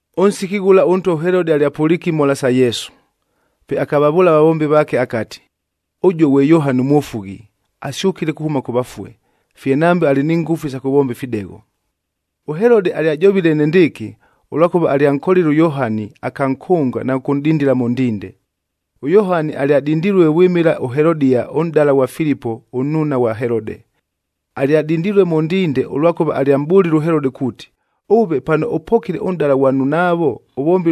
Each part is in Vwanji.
Ʉnsiki ghʉla ʉntwa ʉHelodea alyapʉliike imhola sa Yesu. Pe akavavʉʉla avavombi vaake akati, “Ʉjuo ghwe Yohani ʉMwofughi, asyʉkile kuhʉma kʉ vafue, fye nambe alɨ ni ngʉfu isa kʉvomba ifidegho.” ɄHelode alyajovile enendɨɨkɨ, ʉlwakʉva alyankolile ʉYohani, akankʉnga na kʉkʉnʼdindila mʉ ndinde. ɄYohani alyadindilue vwɨmɨla ʉHelodia, ʉnʼdala ghwa Filipo, ʉnnuuna ghwa Helode. Alyadindilue mʉ ndinde, ʉlwakʉva alyamʼbʉlile ʉHelode kuuti, “Ʉve, pano ʉpokile ʉnʼdala ghwa nnunaavo,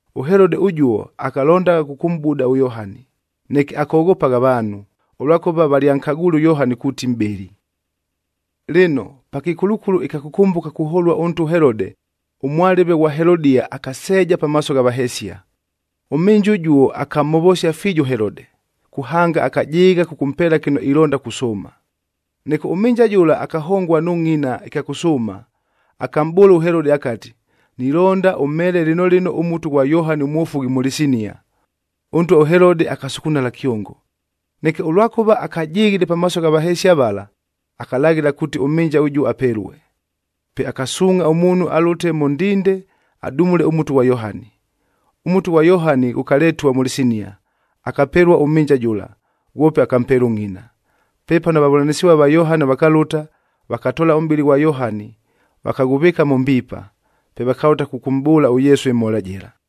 ɄHelode ʉjuo akalondagha kʉkʉmʼbuda ʉYohani, neke akoghopagha avaanhu, ʉlwakʉva valyankagwile ʉYohani kuuti mʼbɨli. Lɨno, pa kɨkulukulu ɨkya kʉkʉmbʉka kuholua ʉntwa ʉHelode, ʉmwalɨve ghwa Helodia akaseeja pamaaso gha vahesia. Ʉmhɨnja ʉjuo akamhovosia fiijo ʉHelode, kuhanga akajɨɨgha kʉkʉmpeela kɨno ilonda kusʉʉma. Neke ʉmhɨnja jʉla akahongua nʉ ngʼina ɨkya kʉsʉʉma, akamʼbʉʉla ʉHelode akati, “Nilonda ʉmheele lɨno lɨno ʉmutu ghwa Yohani ʉMwofughi mʉ lɨsinia.” Ʉntwa ʉHelode akasukunala kyongo. Neke, ʉlwakʉva akajɨghile pamaaso gha vahesia vala, akalaghɨla kuuti ʉmhɨnja ʉjuo apelue. Pe akasuungʼha ʉmuunhu alʉte mʉ ndinde adumule ʉmutu ghwa Yohani. Ʉmutu ghwa Yohani ghʉkaletua mʉ lɨsinia, akapelua ʉmhɨnja jʉla, ghwope akampeela ʉngʼina. Pepano avavʉlanɨsɨvua va Yohani vakalʉta, vakatoola ʉmʼbɨlɨ ghwa Yohani, vakaghʉvɨɨka mʉ mbiipa. Pe vakalʉta kʉkʉmʼbʉʉla ʉYesu ɨmhola jɨla.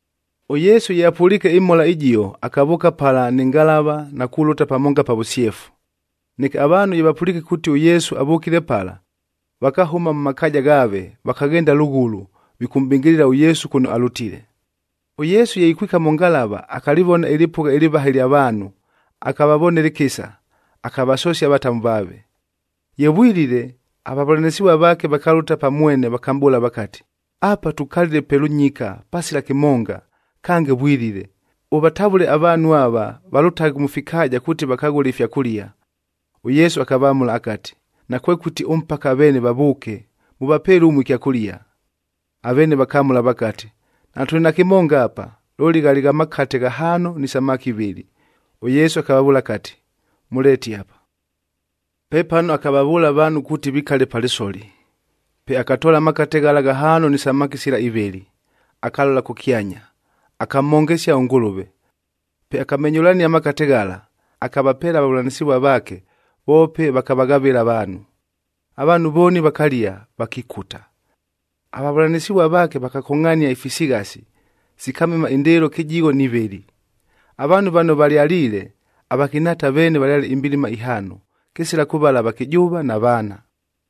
ɄYesu ye apʉliike ɨmhola ɨjio, akavʉʉka pala nɨ ngalava na kulʉta pamonga pa vʉsyefu. Neke avaanhu ye vapʉliike kuuti ʉYesu avʉkile pala, vakahʉma mʉ makaaja ghaave, vakaghenda lʉghʉlʉ, vikʉmʼbɨngɨlɨla ʉYesu kʉno alʉtile. ɄYesu ye ikwika mʉ ngalava, akalɨvona ɨlɨpʉgha ɨlɨvaha ɨlya vaanhu, akavavonela ɨkɨsa, akavasosia avatamu vaave. Ye vwilile, avavʉlanɨsɨvua vaake vakalʉta pa mwene vakamʼbʉʉla vakati, “Apa tukalile pe lʉnyika pasila kɨmonga, kange vwilile, ʉvatavʉle avaanhu ava valʉtaghe mʉ fikaaja kuuti vakaghʉle ifyakʉlia.” ɄYesu akavamʉla akati, “Nakwekʉti ʉmpaka aveene vavʉʉke, mʉvapeele ʉmue ɨkyakʉlia.” Aveene vakamʉla vakati, “Natʉlɨ na kɨmonga apa, looli ghalɨ gha makate ghahaano ni samaki ivɨlɨ.” ɄYesu akavavʉʉla akati, “Mʉleete apa.” Pepano akavavʉʉla avaanhu kuuti vikale pa lɨsoli. Pe akatoola amakate ghala ghahaano ni samaki sila ivɨlɨ, akalola kʉkyanya, akamhongesia ʉNgʉlʉve. Pe akamenyʉlania amakate ghala, akavapeela avavʉlanɨsɨvua vaake, voope vakavaghavɨla avaanhu. Avaanhu vooni vakalia, vakikuta. Avavʉlanɨsɨvua vaake vakakongʼhania ifisighasi, sikamema indɨɨlo kɨjigho ni vɨlɨ. Avaanhu vano valyaliile, avakɨnhaata veene valyale imbilima ihaano, kɨsila kʉvala avakɨjʉʉva na vaana.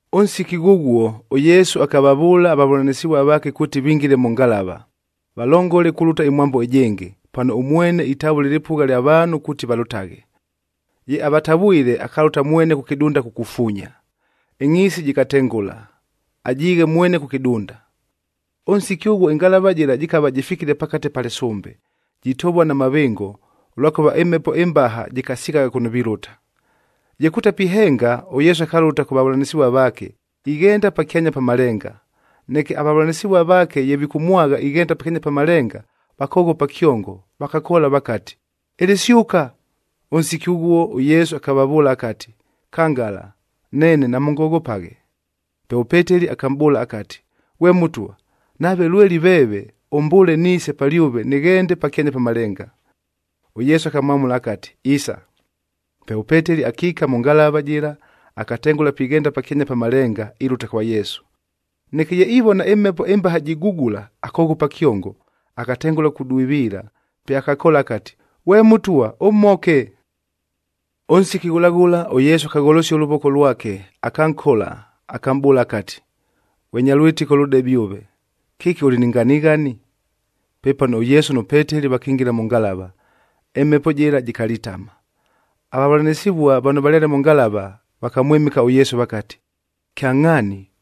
Ʉnsiki ghʉghuo, ʉYesu akavavʉʉla avavʉlanɨsɨvua vaake kuuti vingile mʉ ngalava, valongole kulʉta ɨmwambo ɨjɨngɨ, pano ʉmwene itavʉla ɨlɨpʉgha lya vaanhu kuuti valʉtaghe. Ye avatavwile, akalʉta mwene kʉ kɨdunda kukufuunya. Ɨngʼhiisi jɨkatengʉla, ajiighe mwene kʉ kɨdunda. Ʉnsiki ʉghuo ɨngalavac jɨla jɨkava jɨfikile pakate pa lɨsʉmbe, jitovua na mavɨngo, ʉlwakʉva ɨmhepo ɨmbaha jɨkasighagha kʉno vilʉta. Ye kutapihenga, ʉYesu akalʉta kʉ vavʉlanɨsɨvua vaake, ighenda pakyanya pa malenga. Neke avavʉlanɨsɨvua vaake ye vikʉmwagha ighenda pakyanya pa malenga, vakoghopa kyongo, vakakoola vakati, “Ɨlɨsyʉka!” Ʉnsiki ghʉghuo ʉYesu akavavʉʉla akati, “Kangala, neene, namʉngoghopaghe.” Pe ʉPeteli akamʼbʉʉla akati, “Ghwe Mʉtwa, nave lweli veeve, ʉmbʉʉle niise palyʉve nɨghende pakyanya pa malenga.” ɄYesu akamwamʉla akati, “Isa.” Pe ʉPeteli akiika mʉ ngalava jɨla, akatengʉla pighenda pakyanya pa malenga, ilʉta kwa Yesu. Neke ye ivona ɨmhepo ɨmbaha jigugula, akoghopa kyongo, akatengʉla kudwiviila. Pe akakoola akati, “Ghwe Mʉtwa, ʉmhoke!” Ʉnsiki ghʉla ghʉla, ʉYesu akagholosia ʉlʉvoko lwake, akankola, akamʼbʉʉla akati, “Ghwe nya lwɨtɨko lʉdebe ʉve, kɨki ʉlɨ ni nganighani?” Pepano ʉYesu nʉ Peteli vakingila mʉ ngalava, ɨmhepo jɨla jɨkalitama. Avavʉlanɨsɨvua vano valyale mʉ ngalava, vakamwɨmɨka ʉYesu vakati, “Kyangʼhaani,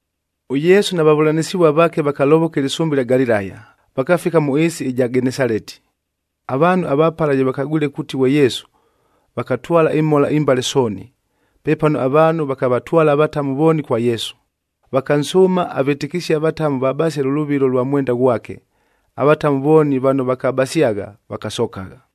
ɄYesu na vavʉlanɨsɨvua vaake vakalovoka ɨlɨsʉmbe ɨlya Galilaya, vakafika mʉ ɨɨsi ɨja Genesaleti. Avaanhu ava pala ye vakagwile kuuti ghwe Yesu, vakatwala imhola imbale sooni. Pepano avaanhu vakavatwala avatamu vooni kwa Yesu, vakansʉʉma avɨtɨkɨsie avatamu vabasie lʉ lʉvilo lwa mwenda ghwake. Avatamu vooni vano vakabasyagha, vakasokagha.